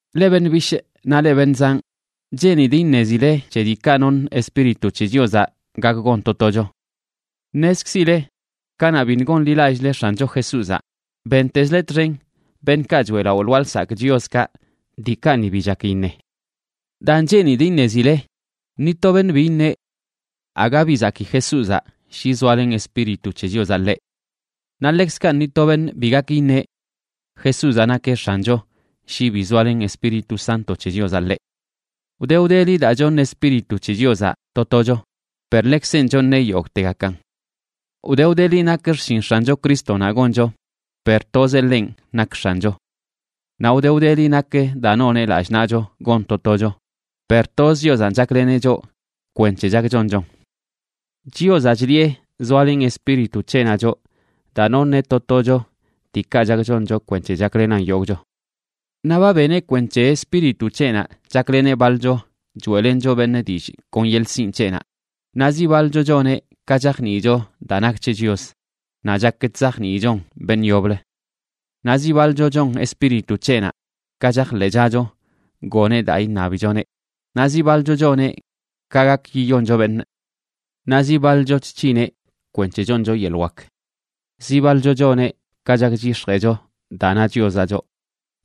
Leꞌ beṉꞌ bishꞌ naꞌ leꞌ beṉꞌ zanꞌ, cheenidꞌ iṉezile c̱he diikaꞌ noṉ Espíritu c̱he Chiozaꞌ gak gon to tocho. Ṉezkzile kanaꞌ biṉꞌ gonḻilallꞌle X̱ancho Jesúzaꞌ, bentezle txen beṉꞌkaꞌ choeꞌlaꞌo lwaa lsakꞌ chioskaꞌ diikaꞌ ni bi chak iṉe. Daan, cheenidꞌ iṉezile ni to beṉꞌ bi iṉeꞌ: “Aga bi zakii Jesúzaꞌ” shi zoalen Espíritu c̱he Chiozaꞌ ḻeꞌ. Naꞌ ḻekzkaꞌ ni to beṉꞌ bi gak iṉeꞌ: “Jesúzaꞌ nakeꞌ X̱ancho” shi bi zoalen Espíritu Santo c̱he Chiozaꞌ ḻeꞌ. Wde wdeli daa choṉ Espíritu c̱he Chiozaꞌ to tocho, per ḻekzenꞌ choṉeꞌ yogꞌtegakan. Wde wdeli nak xshin X̱ancho Crístonaꞌ goncho, per tozeꞌ ḻenꞌ nak X̱ancho. Naꞌ wde wdeli nak daa noneꞌ lallꞌ naꞌcho gon to tocho, per toz Chiozanꞌ chakleneꞌ choꞌ kwenc̱he chak chonchon. Chiozaꞌ chliꞌe zoalen Espíritu c̱heꞌnaꞌ choꞌ daa noṉeꞌ to tocho diikaꞌ chak choncho kwenc̱he chaklenan yogꞌcho. Naꞌ ba beneꞌ kwenc̱he Espíritu c̱heꞌnaꞌ chakleneꞌ baḻcho choeꞌlencho beṉꞌ dillꞌ kon yeḻꞌ sinꞌ c̱heꞌnaꞌ, naꞌ zi baḻcho, choneꞌ ka chajniicho daa nak c̱he Chios naꞌ chak chzajniichon beṉꞌ yoblə. Naꞌ zi baḻcho, chon Espíritu c̱heꞌnaꞌ ka chajḻeꞌchacho goneꞌ daa iṉabichoneꞌ; naꞌ zi baḻcho, choneꞌ ka gak yiyoncho beṉꞌ. Naꞌ zi baḻcho, chc̱hineꞌ kwenc̱he choncho yeḻꞌ wak; zi baḻcho, choneꞌ ka chak chyix̱jeꞌcho daa na Chiozaꞌ choꞌ;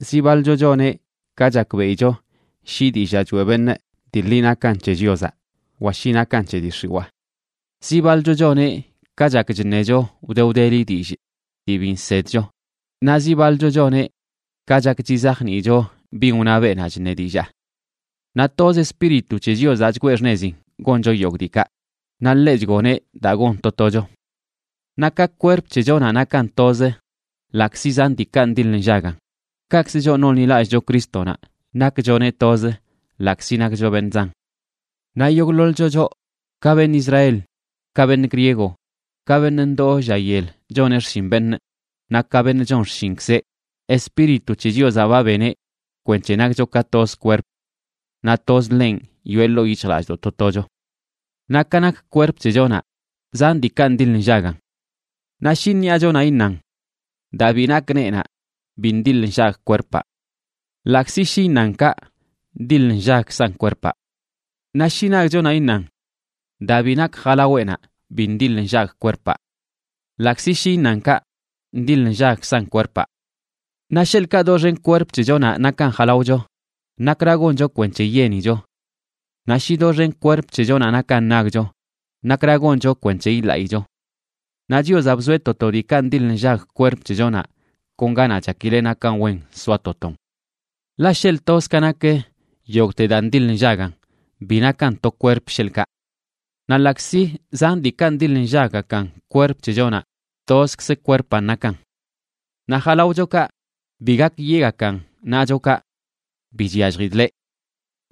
zi baḻcho, choneꞌ ka chakbeꞌicho shi dillaa choeꞌ beṉꞌ dii ḻi nakan c̱he Chiozaꞌ wa shi nakan c̱he dii x̱iwaa. Zi baḻcho, choneꞌ ka chak chṉecho wde wdeli dillꞌ dii bi nsedcho; naꞌ zi baḻcho, choneꞌ ka chak chizajniicho bin wna beenaꞌ chṉe dillaa. Naꞌ toz Espíritu c̱he Chiozaꞌ chgwee xṉezin goncho yogꞌ diikaꞌ, naꞌ ḻeꞌ chgoneꞌ daa gon to tocho. Naꞌ ka kwerp c̱hechonaꞌ nakan toz ḻaꞌkzi zan diikaꞌ ndiḻ nllagan, kaꞌkzə choꞌ nonḻilallꞌcho Crístonaꞌ nakchoneꞌ toz ḻaꞌkzi nakcho beṉꞌ zan. Naꞌ yogꞌḻoḻcho choꞌ, ka beṉꞌ Israel, ka beṉꞌ griego, ka beṉꞌ ndoo lla yel choneꞌ xshin beṉꞌ, naꞌ ka beṉꞌ chon xshinkzeꞌ, Espíritu c̱he Chiozaꞌ ba beneꞌ kwenc̱he nakcho ka toz kwerp. Naꞌ toz ḻenꞌ yoꞌe ḻoo yic̱hjlallꞌdoꞌ to tocho. Naꞌ ka nak kwerp c̱hechonaꞌ, zan diikaꞌ ndiḻ nllagan. Naꞌ shi ṉiꞌachonaꞌ iṉan: “Daa bi nakꞌ neenaꞌ, bi ndiḻ nllagꞌ kwerpaꞌ.” Ḻaꞌkzi shi iṉan kaꞌ, ndiḻ nllagkzan kwerpaꞌ. Naꞌ shi nagchonaꞌ iṉan: “Daa bi nakꞌ jalaweꞌnaꞌ, bi ndiḻ nllagꞌ kwerpaꞌ.” Ḻaꞌkzi shi iṉan kaꞌ, ndiḻ nllagkzan kwerpaꞌ. Naꞌ sheḻꞌkaꞌ doxen kwerp c̱hechonaꞌ nakan jalaocho, ¿nakra goncho kwenc̱he yenicho? Naꞌ shi doxen kwerp c̱hechonaꞌ nakan nagcho, ¿nakra goncho kwenc̱he iḻaꞌicho? Naꞌ Chiozaꞌ bzoeꞌ to to diikaꞌ ndiḻ nllag kwerp c̱hechonaꞌ kon ganaꞌ chakileꞌ nakan wen soa to ton. Ḻaꞌ sheḻꞌ toz ka nak yogꞌte daa ndiḻ nllagan, bi nakan to kwerp sheḻꞌkaꞌ. Naꞌ ḻaꞌkzi zan diikaꞌ ndiḻ nllaggakan kwerp c̱hechonaꞌ, tozkz kwerpan nakan. Naꞌ jalaochokaꞌ bi gak yeꞌgakan naꞌchokaꞌ: “Bi chyalljidꞌ leꞌ.”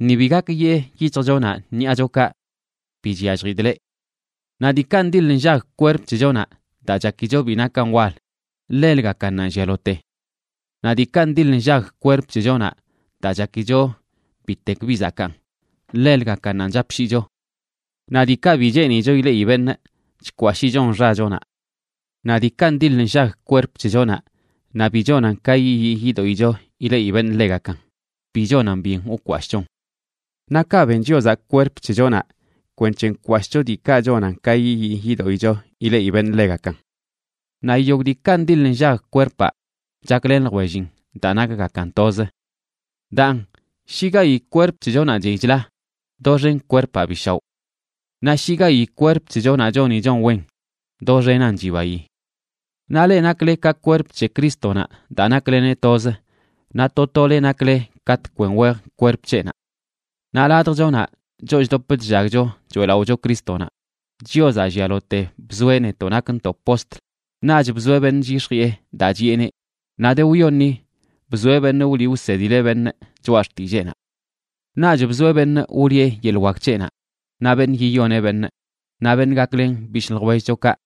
Ni bi gak yeꞌ yic̱hjchonaꞌ ṉiꞌachokaꞌ: “Bi chyalljidꞌ leꞌ.” Naꞌ diikaꞌ ndiḻ nllag kwerp c̱hechonaꞌ daa chakicho bi nakan wal, ḻeləgakannanꞌ llialote. Naꞌ diikaꞌ ndiḻ nllag kwerp c̱hechonaꞌ daa chakicho bitek bi zakaꞌn, ḻeləgakannanꞌ chapshiicho. Naꞌ diikaꞌ bi cheenicho ileꞌi beṉꞌ chkwashiꞌchon xachonaꞌ. Naꞌ diikaꞌ ndiḻ nllag kwerp c̱hechonaꞌ naꞌ bi chonan ka yiyii yidoꞌicho ileꞌi beṉꞌ ḻegakan, bi chonan byen wkwashꞌchon. Naꞌ kaꞌ ben Chiozaꞌ kwerp c̱hechonaꞌ kwenc̱he nkwashꞌcho diikaꞌ chonan ka yiyii yidoꞌicho ileꞌi beṉꞌ ḻegakan. Naꞌ yogꞌ diikaꞌ ndiḻ nllag kwerpaꞌ chaklen ljwellin daa nakgakan toz. Daan shi gayi kwerp c̱hechonaꞌ chey chla, doxen kwerpaꞌ bi shaoꞌ. Naꞌ shi gayi kwerp c̱hechonaꞌ chonichon wen, doxenan chibayi. Naꞌ leꞌ nakle ka kwerp c̱he Crístonaꞌ daa nakleneꞌ toz, naꞌ to tole nakle ka tkwen wej kwerp c̱heꞌnaꞌ. Naꞌ ladjchonaꞌ, choꞌ chdop chllagcho choeꞌlaꞌocho Crístonaꞌ, Chiozaꞌ llialote bzoeꞌ netoꞌ nakntoꞌ postl, naꞌch bzoeꞌ beṉꞌ chyix̱jiꞌe daa chiꞌeneꞌ, naꞌ de wyoṉi bzoeꞌ beṉꞌ wliꞌ wsedileꞌ beṉꞌ choꞌa xtilleenaꞌ. Naꞌch bzoeꞌ beṉꞌ wliꞌe yeḻꞌ wak c̱heꞌnaꞌ, naꞌ beṉꞌ yiyoneꞌ beṉꞌ, naꞌ beṉꞌ gaklen bishꞌ ljwellchokaꞌ,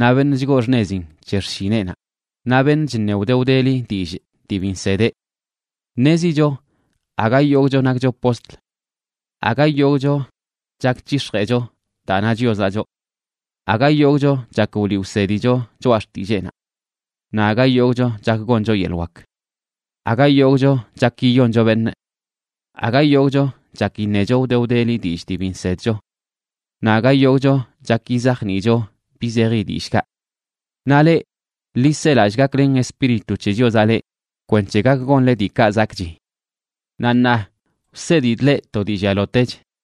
naꞌ beṉꞌ chgoo xṉezin c̱he xshineꞌnaꞌ, naꞌ beṉꞌ chṉe wde wdeli dillꞌ dii bi nsedeꞌ. Ṉezicho aga yogꞌcho nakcho postl. Aga yogꞌcho chak c̱hix̱jeꞌcho daa na Chiozaꞌ choꞌ. Aga yogꞌcho chak wliꞌ wsedicho choꞌa xtilleenaꞌ. Naꞌ aga yogꞌcho chak goncho yeḻꞌ wak. Aga yogꞌcho chak yiyoncho beṉꞌ. Aga yogꞌcho chak iṉecho wde wdeli dillꞌ dii bi nsedcho. Naꞌ aga yogꞌcho chak yizajniicho bi zeji dillꞌkaꞌ. Naꞌ leꞌ, ḻi selallꞌ gaklen Espíritu c̱he Chiozaꞌ leꞌ kwenc̱he gak gonle diikaꞌ zakꞌchi. Naꞌ ṉaa wsedidꞌ leꞌ to dii llialaotech.